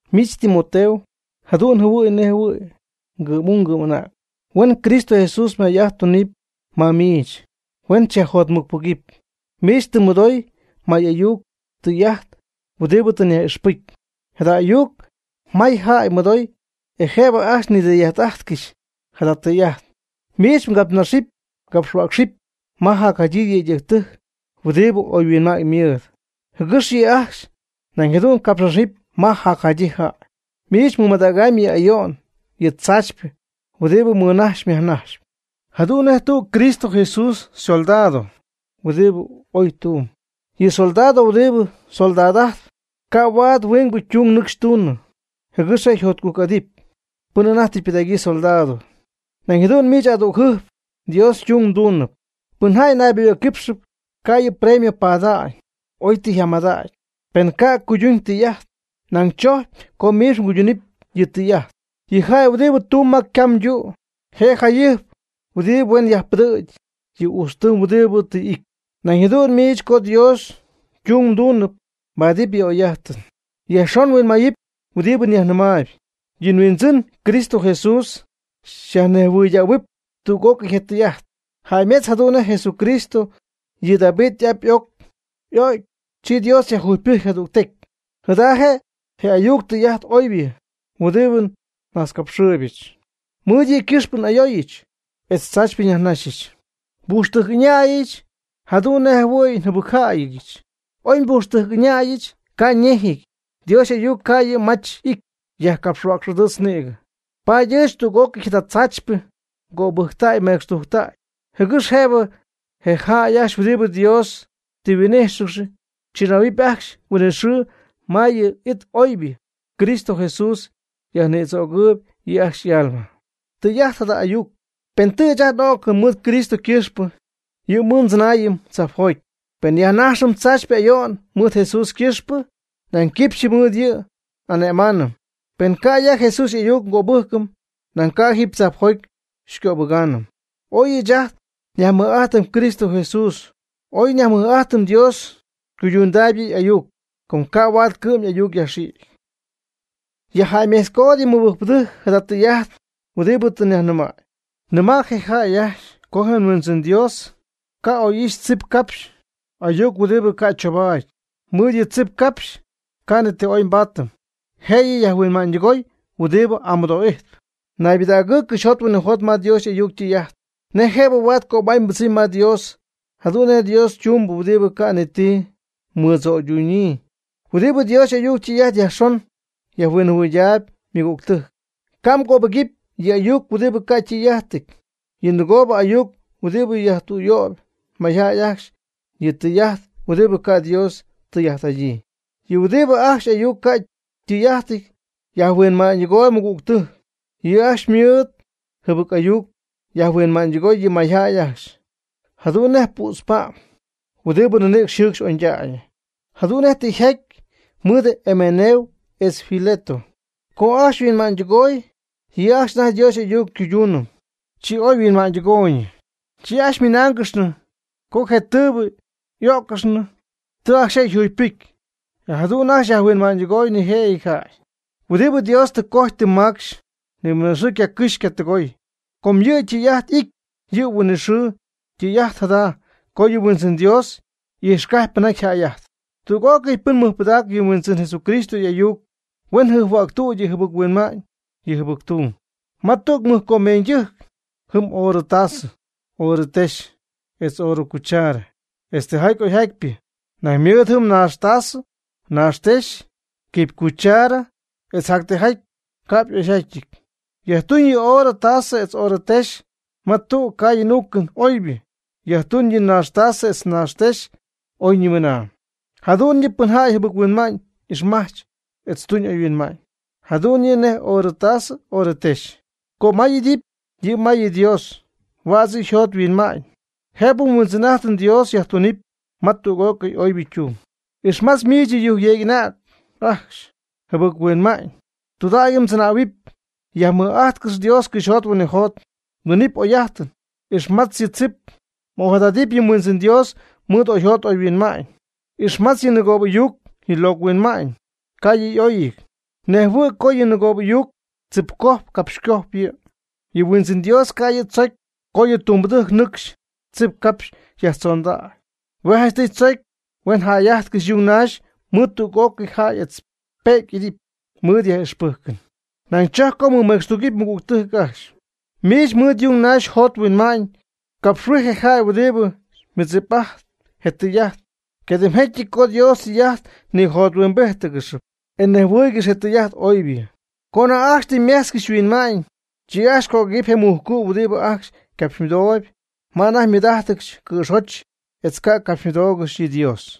Miich Timoteo, jadu'n njɨhuɨ̈y nej ngɨ'm'ung ngɨ'm'anäg. Huen Cristo Jesús may'ajt tunɨpy ma miich, huen xyajjotmɨcpɨgɨpy. Miich tɨ mmɨdoy may'ayuc tɨy'ajt huɨdibɨ tɨ nyaj'ixpɨcy. Jada ayuc mayjäy mɨdoy e jëb ajcxy nidɨy'ajt'ajtcɨxy. Jada tɨy'ajt miich mgapxnaxɨpy mgapxhuäcxɨpy ma jacjadyii yëydɨjctɨjc huɨdibɨ oyhuinma'ñ ymɨɨd, jɨgɨx yɨ' ajcxy nañ jadu'n capxnaxɨpy ma jacjadyii jäy. Miich mɨmadäg yɨ ayo'n yɨ tzaachypɨ huɨdibɨ mmɨnajxyp myajnajxyp, jadu'n nej tüg Cristo Jesús ysoldado huɨdibɨ oy tumb. Yɨ soldado huɨdibɨ soldad'ajtp ca' huaad huingbɨ tung nɨcxy tuñ, jɨgɨx je' yjotcujc'adɨpy pɨn anajty tɨ ypɨdägyii soldado, nañ jadu'n miich adügjɨjp Dios ytung mdunɨpy. Pɨn jäy nayboyɨ̈cquipxɨp ca' yɨ' premio pada'ñ, oy tɨ yjamadägy, pen ca' cuyduñ yɨ tɨy'ajt. Nañ tzocy co miich mguydunɨpy yɨ tɨy'ajt. Je jäy huɨdibɨ tumb ma ycam ytu' je' jayɨjp huɨdib huen yajpɨdɨ̈gy yɨ ujtztɨɨm huɨdibɨ tɨ y'ity. Nañ jadu'n miich co Dios ytung mduunɨp mbaadɨp yɨ oy'ajtɨn. Yajxon mhuinmayɨpy huɨdibɨ nyajnɨmaayb, yɨ Huindzɨn Cristo Jesús xyajnejhuɨydähuɨpy tüg'ócɨy je' ytɨy'ajt. Jäymetz jadu'n nej Jesucristo, yɨ David y'ap y'oc, y'o'cy, chi Dios yajjugypɨjcy jadügtecy. Jada je' je ayuc tɨy'ajt oybɨ huɨdibɨ nnajtzcapxɨɨybɨch. Mɨɨd yɨ' ycɨxpɨ n'ayooyɨch etz tzaachypɨ nyajnajxyɨch. Nbujxtɨjc ɨñäyɨch jadu'n nej jɨhuɨ̈y njɨbɨcjäyɨch. Oy njapujxtɨjc ɨñäyɨch ca' ñejɨty, Dios y'ayuc ca' yɨ' mach y'ity, yajcapxhuäcx'adɨɨtzp nïgɨ. Paady ɨɨch tüg'ócɨy jada tzaachypɨ ngöbɨjctäy nmecxtujctäy, jɨgɨx jëbɨ je jäy ajcxy huɨdibɨ Dios tɨ yhuin'íjxɨgɨxy chɨnähuɨpy ajcxy huinɨxɨɨ ma yɨ' y'it oybɨ, Cristo Jesús yajnïdzögɨɨb yɨ' ajcxy y'alma. Tɨy'ajt jada ayuc: Pen tɨ ɨɨch ajt n'o'cɨm mɨɨd Cristo ycɨxpɨ, yɨ' mɨɨd ndzɨnaayɨm tzajpjoty. Pen nyajnajxɨm tzaachypɨ ayo'n mɨɨd Jesús ycɨxpɨ, nañ quipxyɨ mɨɨd yɨ' n'ane'maanɨm. Pen ca' ya Jesús y'ayuc ngöbɨjcɨm, nañ ca' jiib tzajpjoty xycöbɨgaanɨm. Oy ɨɨch ajt nyajmɨj'ajtɨm Cristo Jesús o ngayajmɨj'ajtɨm, Dios ycuydundaayb yɨ' y'ayuc. Com ca' huaad ycɨ'm ayuc yajxïgy. Yajjäymejtzcood yɨ mɨbɨjcpɨdɨjc jada tɨy'ajt huɨdibɨ tɨ nyajnɨmäy. Nɨma' je jäy ajcxy co je Huindzɨn Dios ca' oy'ixy tzip capxy ayuc huɨdibɨ ca' choobaady. Mɨɨd yɨ tzip capxy ca' ni ti oybɨ nbaatɨm, jëyɨ yajhuinma'ñydɨgoy huɨdibɨ amɨdoo'ijtp. Naybɨdägɨɨ cɨxyjot huinɨjot ma Dios y'ayuc ytɨy'ajt, nej jëb huaad cömay mbɨdzɨmy ma Dios, jadu'n nej Dios ytumbɨ huɨdibɨ ca' ni ti mɨdzöydunyii, huɨdibɨ Dios y'ayuc ytɨy'ajt yajxon yajhuinjɨhuɨydaayb ymɨgügtɨjc. Ca' mgöbɨgɨpy yɨ ayuc huɨdibɨ ca' ytɨy'ajtɨty, yɨ nɨgoob ayuc huɨdibɨ yajtüyöyp mayjäy ajcxy, yɨ tɨy'ajt huɨdibɨ ca' Dios ytɨy'ajt'adyii. Yɨ huɨdibɨ ajcxy y'ayuc ca' ytɨy'ajtɨty yajhuinma'ñydɨgooyb ymɨgügtɨjc. Yɨ' ajcxy mɨɨd jɨbɨc ayuc yajhuinma'ñydɨgoy yɨ mayjäy ajcxy, jadu'n nej pützpa'm huɨdibɨ ninïcx jɨcxp oñydägy. Jadu'n nej tɨ yjaty mɨɨd Hemeneo etz Fileto co ajcxy yhuinma'ñydɨgooy. Yɨ' ajcxy anajty Dios y'ayuc cuyduunɨ, chi oyhuinma'ñydɨgooyñɨ. Chi ajcxy ymɨnáangɨxnɨ co je tɨɨbɨ y'öccɨxnɨ, tɨ ajcxy je' yjugypɨcy, e jadu'n ajcxy yajhuinma'ñydɨgoy nijëjɨty jäy. Huɨdibɨ Dios tɨ cojy tɨ macxy, nimɨnaxɨɨ ycacɨxy ycatɨgooy, com yɨ' ytɨy'ajt ijtp yɨ' huinɨxɨɨ. Tɨy'ajt jada co yɨ Huindzɨn Dios y'ijxcajpy pɨnjaty yjäy'ajtpy. Tüg'ócɨy pɨn mɨjpɨdacp yɨ nHuindzɨn Jesucristo y'ayuc, huen jɨjphuäctüdy yɨ jɨbɨc-huinma'ñ yɨ jɨbɨc-tung. Ma tüg mɨj comeeñydɨjc jɨm oorɨ taasɨ, oorɨ texy, etz oorɨ cuchara, etz tijaty oyjatypɨ. Nañ ymɨɨd jɨm naax taasɨ, naax texy, quipy cuchara etz jactijaty ca'p y'oyjatyɨty. Yajtuñ yɨ oorɨ taasɨ etz oorɨ texy ma tügɨ caayɨn uucɨn oybɨ. Yajtuñ yɨ naax taasɨ etz naax texy oyñimɨnaa. Jadu'n yɨ' pɨn jäy jɨbɨc-huinma'ñ ixmajtzp etz tuñ oyhuinma'ñ, jadu'n yɨ' nej oorɨ taasɨ oorɨ texy. Cömay'idɨp yɨ' ma yɨ Dios. Huädz yɨ' yjot yhuinma'ñ, jëbɨ nHuindzɨn'ajtɨm Dios yajtunɨpy ma tüg'ócɨy oybɨ tung. Ixmatz miich yɨ yujcyeec'anäg ajcxy yjɨbɨc-huinma'ñ. Tudägy mdzɨnähuɨpy. Yajmɨj'ajtcɨx Dios cɨxyjot huinɨjot. Mdunɨpy oyjäy'ajtɨn. Ixmatz yɨ tzip. M'ojadadɨpy yɨ Huindzɨn Dios mɨɨd oyjot oyhuinma'ñ. Ixmatz yɨ nɨgoobɨ'ayucɨty yɨ locɨ huinma'ñ, ca' yɨ' y'oyɨty. Mnejhuɨɨyb co yɨ nɨgoobɨ'ayuucɨty tzipcojp capxycojp yɨ'. Yɨ Huindzɨn Dios ca' yɨ' tzocy co yɨ' ytumbɨdɨjc nɨcxy tzip capxy yajtzondägy. Hue' janchtɨy tzocy huen jäy'ajtcɨxy yung naxy mɨɨd tüg'ócɨy jäy etz pe'cy y'idɨpy mɨɨd yaj'ixpɨjcɨn. Nañ chojcpy co mɨmecxtugɨpy ymɨgügtɨjc ajcxy. Miich mɨɨd yung naxy mjot mhuinma'ñ capxhuij je jäy huɨdibɨ mɨdzip'ajtp je tɨy'ajt. Ycadimjecyɨty co Dios ytɨy'ajt nijothuimbíjtcɨxɨpy, e nejhuɨ́ɨygɨxyɨpy je tɨy'ajt oybɨ. Co anajty ajcxy tɨ ymejtzcɨxy yhuinma'ñ, chi ajcxy ycöguëgɨɨyb je mujcu' huɨdibɨ ajcxy ycapxymɨdooyb ma anajty ymɨɨd'ajtcɨxy cɨ̈joty etz ycapxymɨdoogɨxpy yɨ Dios.